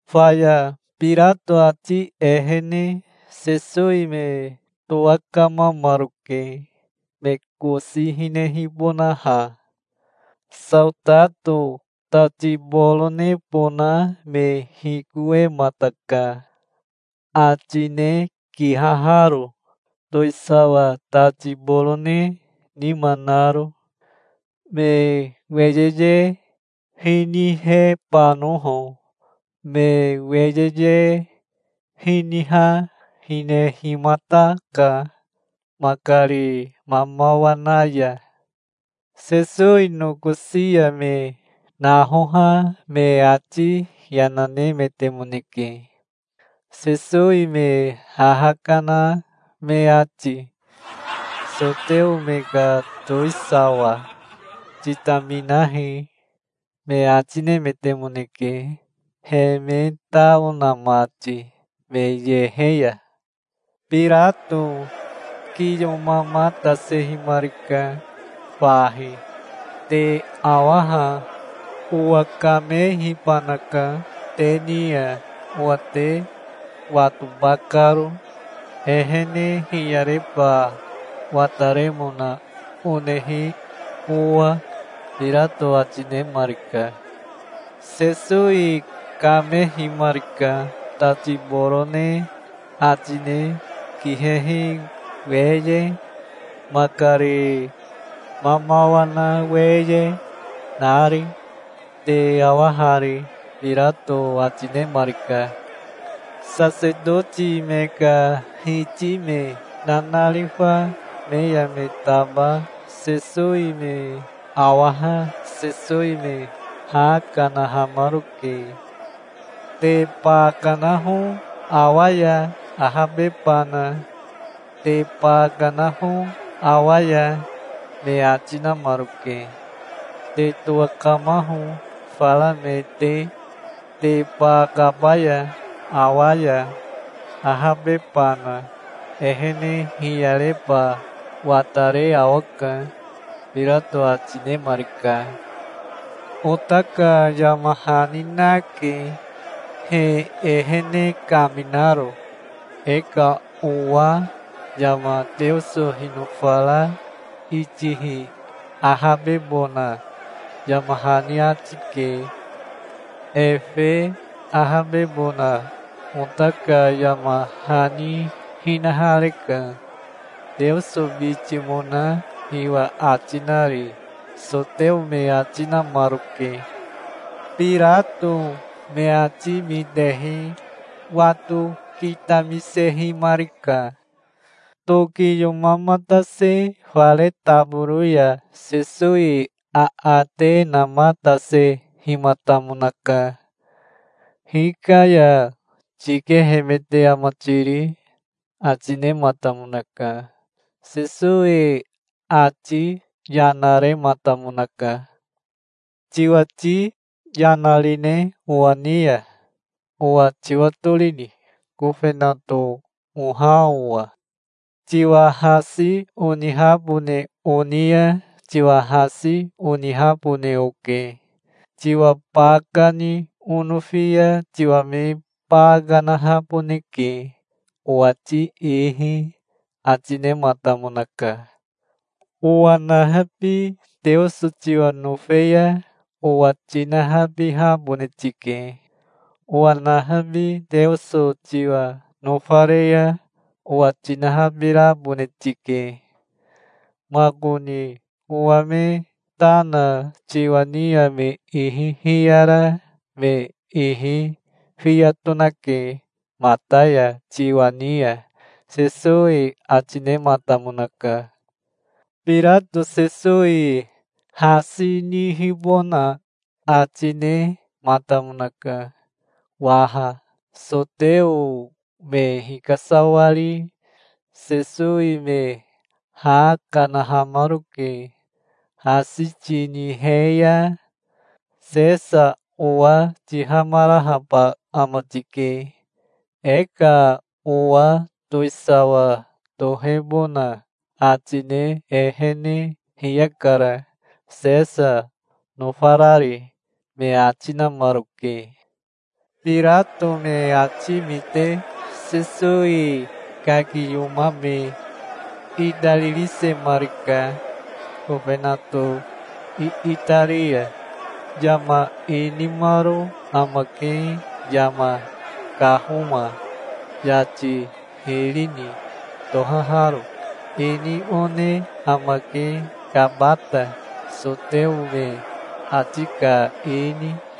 Faya Birato ati ehene Sesowi me towakamamaroke, me kosi hinehibonaha. Saotato tati boronebona me hikowemataka, atine kihaharo, towisawa tati borone nima naro, me weyeye hinihebanoho. Me weyeye hiniha hinehimataka makari mamawa na ya. Sesowi nokosi ya me nahoha me ati yana nemetemoneke, Sesowi me haha kana me ati. "Soteo me ka towisawa, titaminahi", me ati nemetemoneke, he me tao na mati me yehe ya. Birato kiyomamatasehimarika fahi. "Te awa ha. Owakamehibanaka te ni ya, owa te watoba karo, ehene hiyareba wataremona onehi owa", Birato ati nemarika. Sesowi kamehimarika, tati borone atine kihehi weye, makari mamawa na weye, nari. "Te awa hari", Birato ati nemarika. Sasetoti me ka hiti me nanarifa me ya me taba Sesowi me awaha Sesowi me ha kanahamaroke. "Te ba kanaho awa ya, ahabebana. Te ba kanaho awa ya", me ati namaroke. "Te towakamaho, fara me te, te ba kabaya awa ya, ahabebana. Ehene hiyareba watare awaka", Birato ati nemarika. "Ota ka yama hani nake, he ehene kaminaro. E ka owa yama Teoso hinofara itihi ahabebona yama hani ati ke. Efe ahabebona ota ka yama hani hinahareka, Teoso bitimona hiwa ati nari", soteo me ati namaroke. Birato me ati mitehi wato kitamisehimarika. Tokiyomamatase fare taboro ya Sesowi aate namatasehimatamonaka. "Hika ya tikehemete ama tiri?" ati nematamonaka. Sesowi ati yana rematamonaka. "Tiwati yana rine owa ni ya? Owa tiwatorini, kofenato oha owa? Tiwa hasi onihabone oni ya tiwa hasi onihabone oke. Tiwa ba kani onofi ya tiwa me ba kanahaboneke, owati ihi", ati nematamonaka. "Owa nahabi Teoso tiwa nofe ya owa tinahabihabone tike. Owa nahabi Teoso tiwa nofare ya owa tinahabirabone tike. Makoni owa me ta na tiwa ni ya me ihi hiyara me ihi fiya tonake mata ya tiwa ni ya", Sesowi ati nematamonaka. Birato Sesowi hasi nihibona ati nematamonaka waha. Soteo me hikasawari Sesowi me ha kanahamaroke. "Hasi tinihe ya Sesa owa tihamarahaba ama tike. E ka owa towisawa tohebona ati ne ehene hiyakara, Sesa nofarari", me ati namaroke. Birato me ati mite Sesowi kakiyomame itaririsemarika kofenato iitari ya. Yama inimaro amake, Yama Kahoma Yati Hiri ni tohaharo. Ini one amake Kabata, soteo me ati ka ini.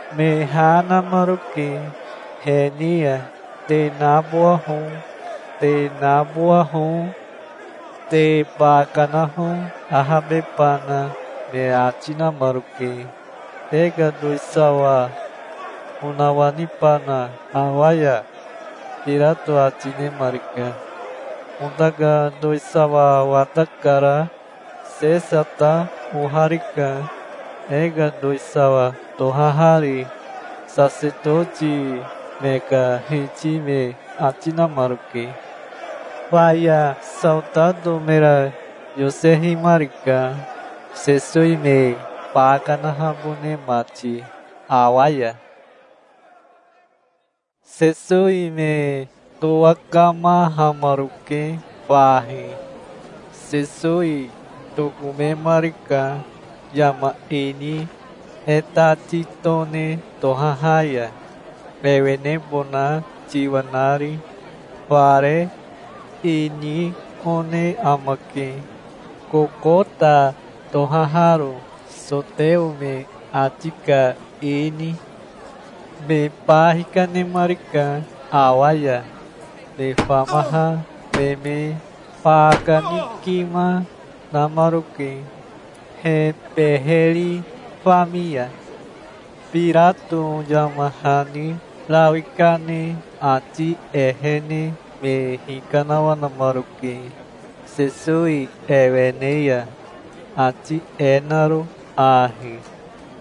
Me ha namaroke he ni ya. "Te nabowaho. Te nabowaho. Te ba kanaho, ahabebana", me ati namaroke. "Te ka towisawa onawanibana awa ya?" Birato ati nemarika. "Ota ka towisawa watakara. Sesa ta oharika, e ka towisawa tohahari", sasetoti me ka hiti me ati namaroke. Faya saotato mera yosehimarika, Sesowi me ba kanahabone mati awa ya. Sesowi me towakamahamaroke fahi. Sesowi tokomemarika yama ini E Tati Tone tohaha ya, ewenebona tiwa nari, fare. Ini one amake, Kokota tohaharo, soteo me ati ka ini. Me ba hikanemarika awa ya. Me famaha me me ba kanikima namaroke, he beheri fami ya. Birato yama hani rawi kane ati ehene me hikanawanamaroke Sesowi ewene ya, ati e naro ahi: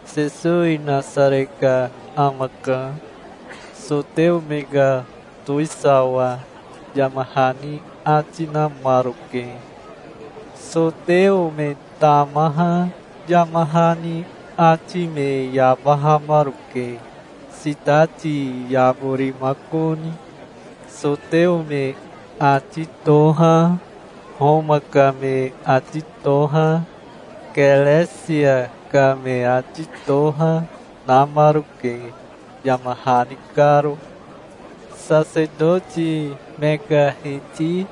"Sesowi Nasare ka amaka, soteo me ka towisawa", yama hani ati namaroke. Soteo me tamaha yama hani ati me yabahamaroke, sitati yaborimakoni. Soteo me ati toha, Homa ka me ati toha, Keresia ka me ati toha, namaroke, yama hani karo. Sasetoti me ka hiti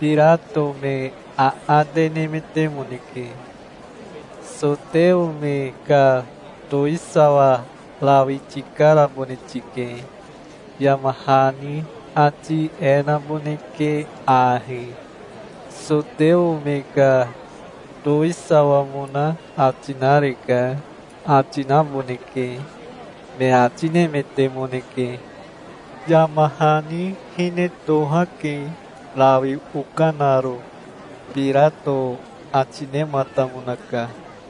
Birato me aate nemetemoneke. "Soteo me ka towisawa rawi tikarabone tike. Yama hani ati e naboneke ahi: 'Soteo me ka towisawamona ati nareka', ati naboneke", me ati nemetemoneke. "Yama hani hine tohake, rawi okanaro", Birato ati nematamonaka.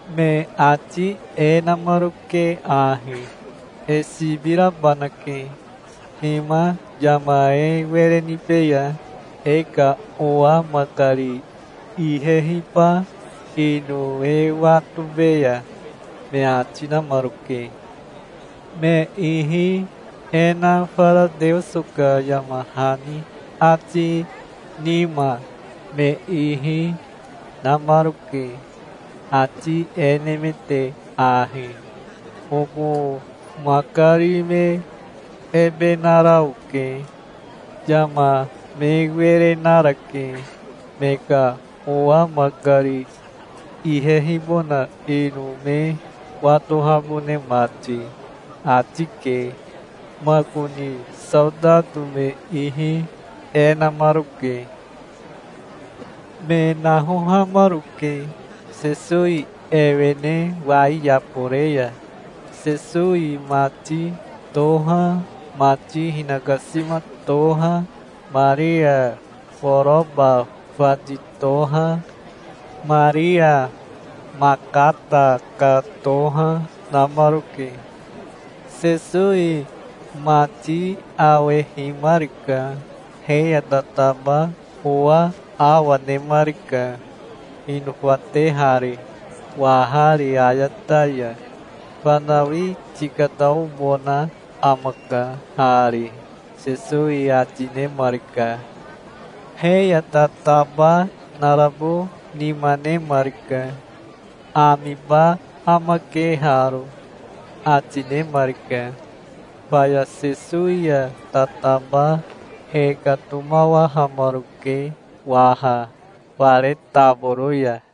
Me ati e namaroke ahi: "E sibi rabanake. Hima yama e were nibeya, e ka owa makari ihehiba ino e watobeya", me ati namaroke. Me ihi e na fara Teoso ka yama hani atini nima me ihi namaroke, ati e nemete ahi: "Oko makari me ebe nara oke. Yama me were narake, me ka owa makari ihehibona ino me watohabone mati", ati ke. Makoni saotato me ihi e namaroke. Me nahohamaroke Sesowi ewene wai yabore ya. Sesowi mati toha, mati hinakasima toha, Maria Koroba fati toha, Maria Makata ka toha, namaroke. Sesowi mati awehimarika. He ya tataba owa awa nemarika hinofatehari, wahari ayata ya."Fanawi tikataobona amaka hari", Sesowi ati nemarika. He ya tataba narabo nima nemarika. "Amiba amake haro", ati nemarika. Faya Sesowi ya tataba hekatomawahamaroke waha fare taboro ya.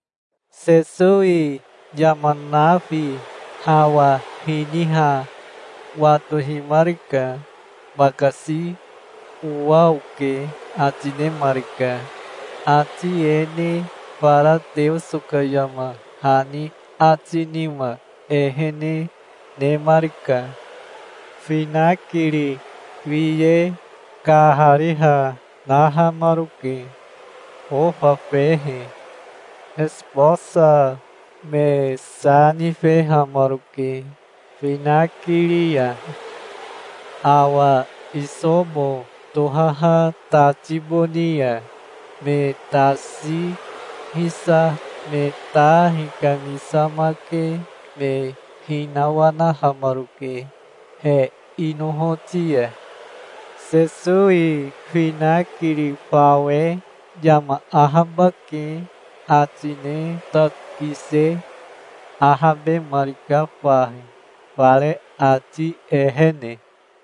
Sesowi yama nafi hawa hiniha watohimarika. "Bakasi owa oke", ati nemarika. Ati e ne fara Teoso ka yama hani ati nima ehene nemarika. Finakiri wiye kahariha nahamaroke, ofa fehe. Esibosa me sa nifehamaroke finakiri ya. Awa isobo tohaha tati boni ya me tasi hisa me ta hikamisamake me hinawanahamaroke he inohoti ya. Sesowi finakiri fawe "Yama ahabake", ati ne tati kise ahabemarika fahi, fare ati ehene.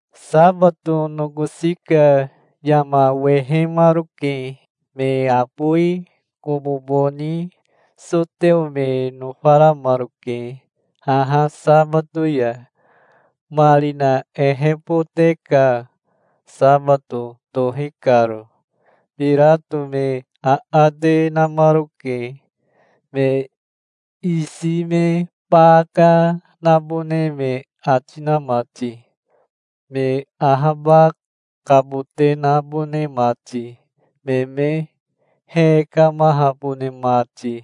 Sabato nokosi ka yama wehemaroke. Me abowi kobobo ni soteo me nofaramaroke haha sabato ya, marina ehebote ka sabato tohi karo. Birato me aate namaroke, me isi me baka nabone me ati na mati, me ahabakabote nabone mati, me me hekamahabone mati.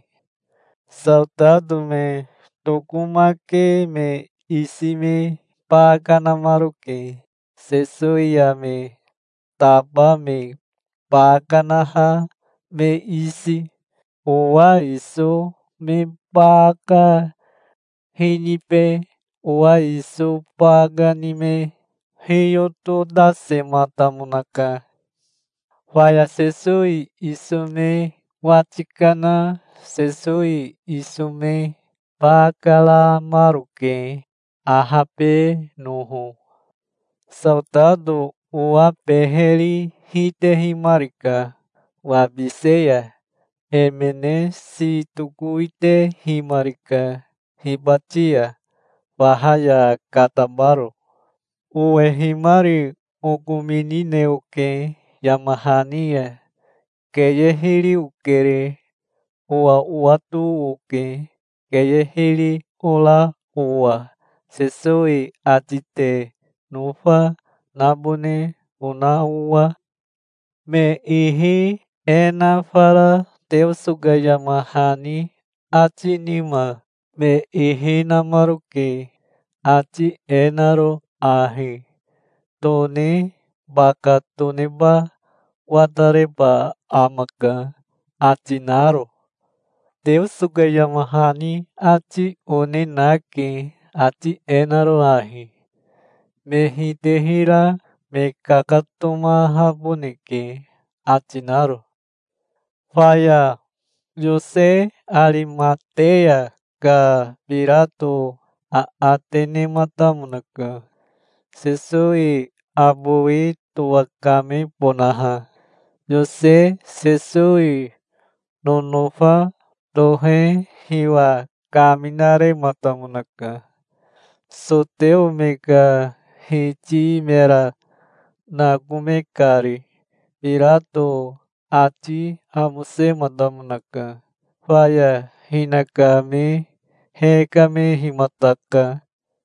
Saotato me tokomake me isi me baka namaroke, Sesowi ya me taba me ba kanaha me isi. Owa iso me baka hinibe owa iso baka ni me hiyototasematamonaka. Faya Sesowi iso me wati kana Sesowi iso me baka ramaroke, ahabenoho. Saotato owa beheri hitehimarika wabise ya. Emene si tokowitehimarika hibati ya, faha ya katabaro. Owehimari okominine oke yama hani ya. Keye hiri okere. Owa owato oke, keye hiri ora owa, Sesowi ati te nofa nabone ona owa. Me ihi e na fara Teoso ka yama hani ati nima me ihi namaroke, ati e naro ahi: "Tone baka toneba watareba amaka", ati naro. Teoso ka yama hani ati one nake, ati e naro ahi: "Me hitehira me kakatomahaboneke", ati naro. Faya Yose Arimateya ka Birato aate nematamonaka, Sesowi abowi towakebonaha. Yose Sesowi nonofa tohe hiwa kaminarematamonaka, soteo me ka hiti mera nakome kari. Birato ati amosematamonaka. Faya hinakame hekamehimataka.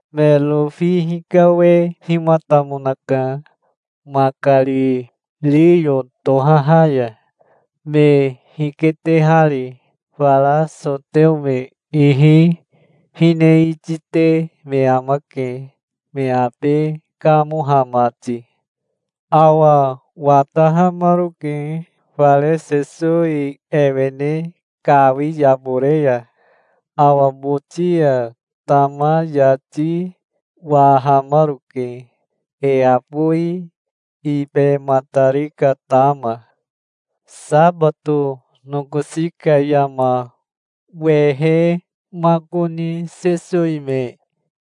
Me rofi hikawehimatamonaka makari riyo tohaha ya, me hiketehari. Fara soteo me ihi hine itite me amake, me abe kamoha mati. Awa watahamaroke fare Sesowi ewene kawi yabore ya. Awa boti ya tama yati wahamaroke, e abowi ibematari ka tama. Sabato nokosi ka yama wehemakoni Sesowi me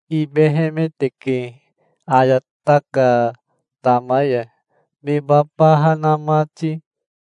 ibehemeteke ayata ka tama ya, me babaha na mati.